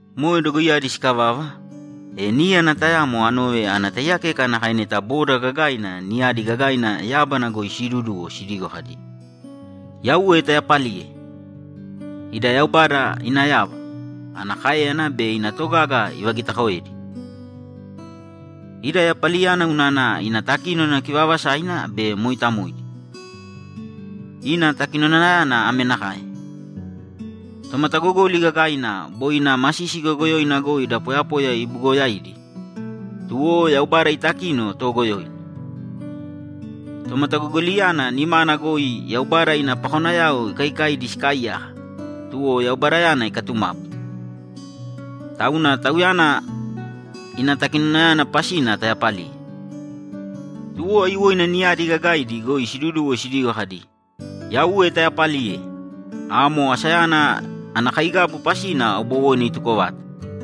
Moe dogoiyadi sikavava, e níyana tayamo anove ana taiyakeka nakae neta boda gagaaina niyadi gagaina yábana goi siiduduwo sidigo kadi, ‘Yauwe tayapalīye! Ida Yaubada ina yava, ana káeyana be ina togaga ivagitakoedi! Ida yapaliyana unana ina takínona kivaavasaina be mooitamoidi. Ina takinonayana ame nakae: Tomatagogoli gagaina boi ina masisi goyogoyoina goi da poyapoya ibugoyaidi, tuwo Yaubada itakino toogoyoina. Tomatagogoliyana nimana goi Yaubada ina pakonayao ikaikaidi sikaaiyaka, tuwo Yaubadayana ikatumapu. Tauna Tauyana ina takinonayana pasina tayapalīye!’ Tuwo aiyuwoina niyadi gagaidi goi siduduwo sidigo kadi, ‘Yauwe tayapalīye! Amo asayana ana kaigabu pasina aubowoina ituko vata.’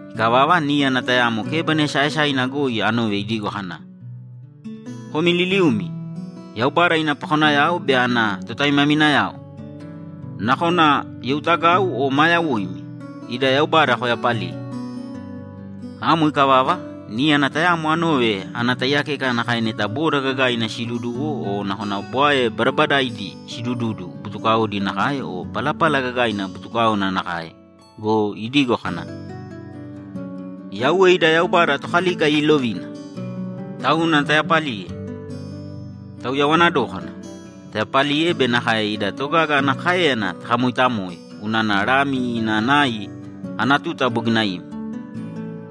Ikavava, níyana tayamo kébana esaaesaina goi anove idigo kana, ‘Komi liliumi, Yaubada ina pakonayao be ana totaimaminayao, nakona youtagau o maa yoimi, ida Yaubada koyapalīye!’ Amo ikavava, níyana tayamo anove ana taiyakeka nakae neta boda gagaaina siiduduwo o nakona bwae badabadaidi sidududu butukaodi nakae o palapala gagaina butukáona nakae go, idigo kadi, ‘Yauwe ida Yaubada Tokalika iilovina! Tauna tayapalīye! Tauyawana dōkana, tayapalīye be nakae ina togaga ana káeyana takamoitamōe unana Lami ina nai ana tuta bogina ima.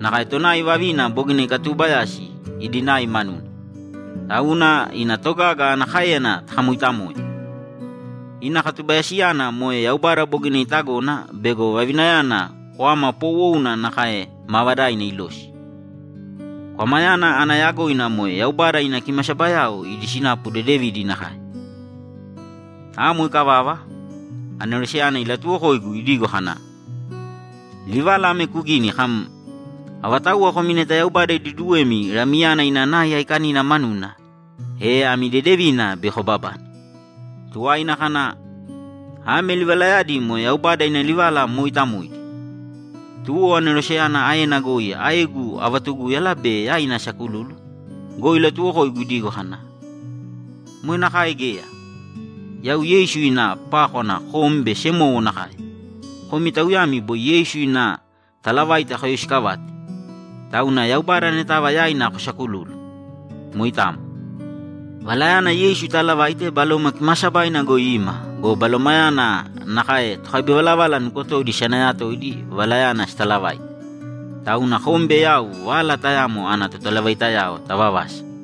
Nakae tonai vavina bogina ikatubayasi idi nai manuna! Tauna ina togaga ana káeyana takamoitamōe! Ina katubayasiyana moe Yaubada bogina itagona bego vavinayana kwama poowouna nakae maavadaina ilosi.’ Kwamayana ana yagoina moe Yaubada ina kimasabayao idi sinapu dedevidi nakae. Amo ikavava, aneroseyana ilatuwokoigu idigo kana, ‘Livala ame kugīni kam, “Avatauwa komi neta Yaubada iduduwemi Lamiyana ina nai aikanina manuna, e ami dedevina bei kobabane.”’ Tuwaina kana, ‘Ame livalayadi moe Yaubada ina livala mooitamoidi!’ Tuwo aneroseyana aena goi aegu avatugúyala be yaina asakululu go, ilatuwokoigu idigo kana, ‘Moe nakae geya! Yau Yeisu ina pákwana kom be semowo nakae, komi tauyami boi Yeisu ina talavaita koyoisikavate. Tauna Yaubada anetava yaina kusakulūlu. Moitamo. Valayana Yeisu itaalavaite Baloma Kimaasabaina goi ima go, Balomayana nakae tokabivalavala nukotodi isanayatoidi valayana sitalavaite. Tauna kom be yau vala tayamo ana totalavaitayao tavavasa.’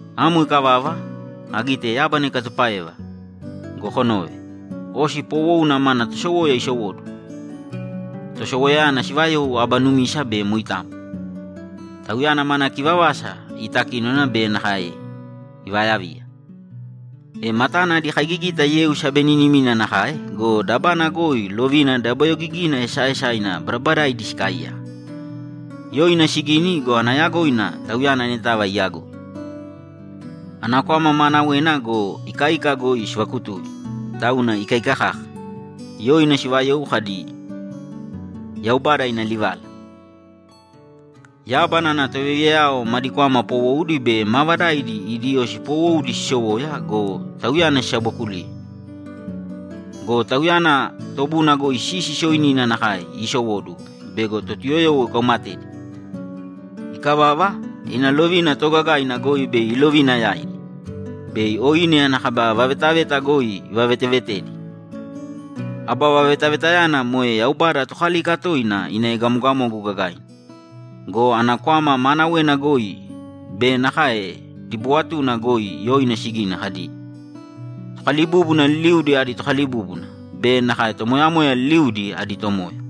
Amo ikavava, agite yábana ikatupáeva go, kunōve! Osi poowouna mana tosowoya isowóduwo. Tosowoyayana sivayou Aba Numisa be Moitamo. Tauyana mana kivavasa itakínona be nakae ivayaviya. E matana adi kaigigita yeu sabeninimina nakae go, dabana goi lovina dabayogigina esaaesaina badabadaidi sikaaiyaka. Yoina sigini go, ana yagoina Tauyana anetava iyagoi. Ana kwama maanawena go, ikaika goi sivakutui, tauna ikaika kaka. Yoina sivayou kadi, ‘Yaubada Ina Livala.’ Yábana ana tovayaviyayao madi kwama poowoudi be maavadaidi idi osi poowoudi sisowoya go, Tauyana sisabookuliye. Go Tauyana tobuna goi sisi sooinina nakae iisowóduwo bego Totuyoyowo ikaumatedi. Ikavava, ina lovina toogagaina goi bei ilovina yaidi. Bei oine ana kaba vavetaveta goi ivavetevetedi; aba vavetavetayana moe Yaubada Tokalika toina ina egamogamogu gagaina. Go ana kwama maanawena goi be nakae dibuwatuna goi yoina sigini kadi, ‘Tokalibúbuna liliudi adi Tokalibúbuna be nakae tomoyamoya liliudi adi Tomoya.’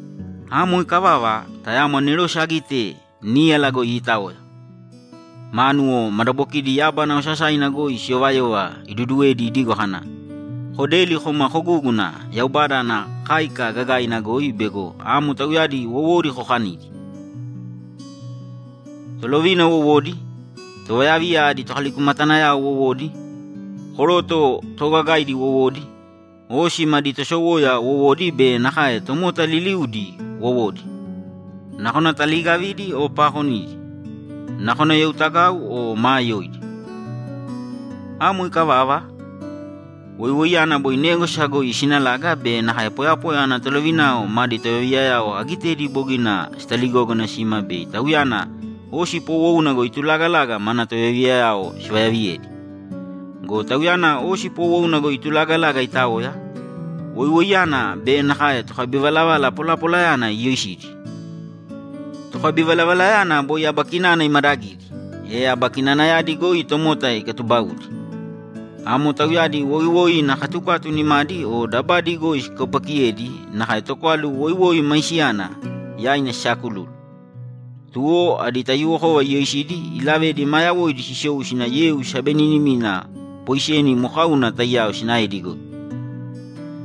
Amo ikavava, tayamo anerose agite níyala goi iitaoya, mánuwo madabokidi yábana osasaina goi siyovayova iduduwedi idigo kana, ‘Kodēli kōma kogūguna Yaubada ana káika gagaina goi bego amo tauyadi wowodi kokanidi: Tolovina wowodi, tovayaviya adi tokalikumatanayao wowodi, koroto toogagaidi wowodi, osi madi tosowoyayao wowodi be nakae tomota liliudi wowodi, nakona taliigavidi o paakonidi, nakona youtagau o maa yoidi.’ Amo ikavava, woiwoiyana boi négwasa goi isinalaga be nakae poyapoya ana tolovinao madi tovayaviyayao agitedi bogina sitaligógana sima bei Tauyana osi poowouna goi iitulaga mana tovayaviyayao sivayaviyedi. Go Tauyana osi poowouna goi iitulaga itaoya, woiwoiyana be nakae tokabivalavala polapolayana iyoisidi. Tokabivalavalayana boi aba kinana imadagidi, e aba kinanayadi goi tomota ikatubaudi. Amo tauyadi woiwoi ina katukatu nimadi o dabadi goi sikaupakiyedi nakae tokwalu woiwoi maisiyana yaina sisaakululu. Tuwo adi taiyuwokova iyoisidi ilavedi ma yawoidi sisou sina yeu sabeninimina poiseni mokauna taiyao sinaedi goi.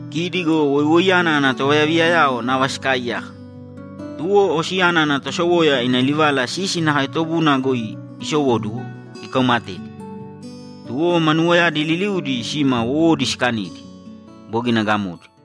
Kidi go woiwoiyana ina tovayaviyayao nava sikaaiyaka, tuwo osiyana ana tosowoya ina livala sisi nakae tobuna goi isowóduwo ikaumatedi. Tuwo manuwoyadi liliudi sima wowodi sikanidi, bogina gamodi.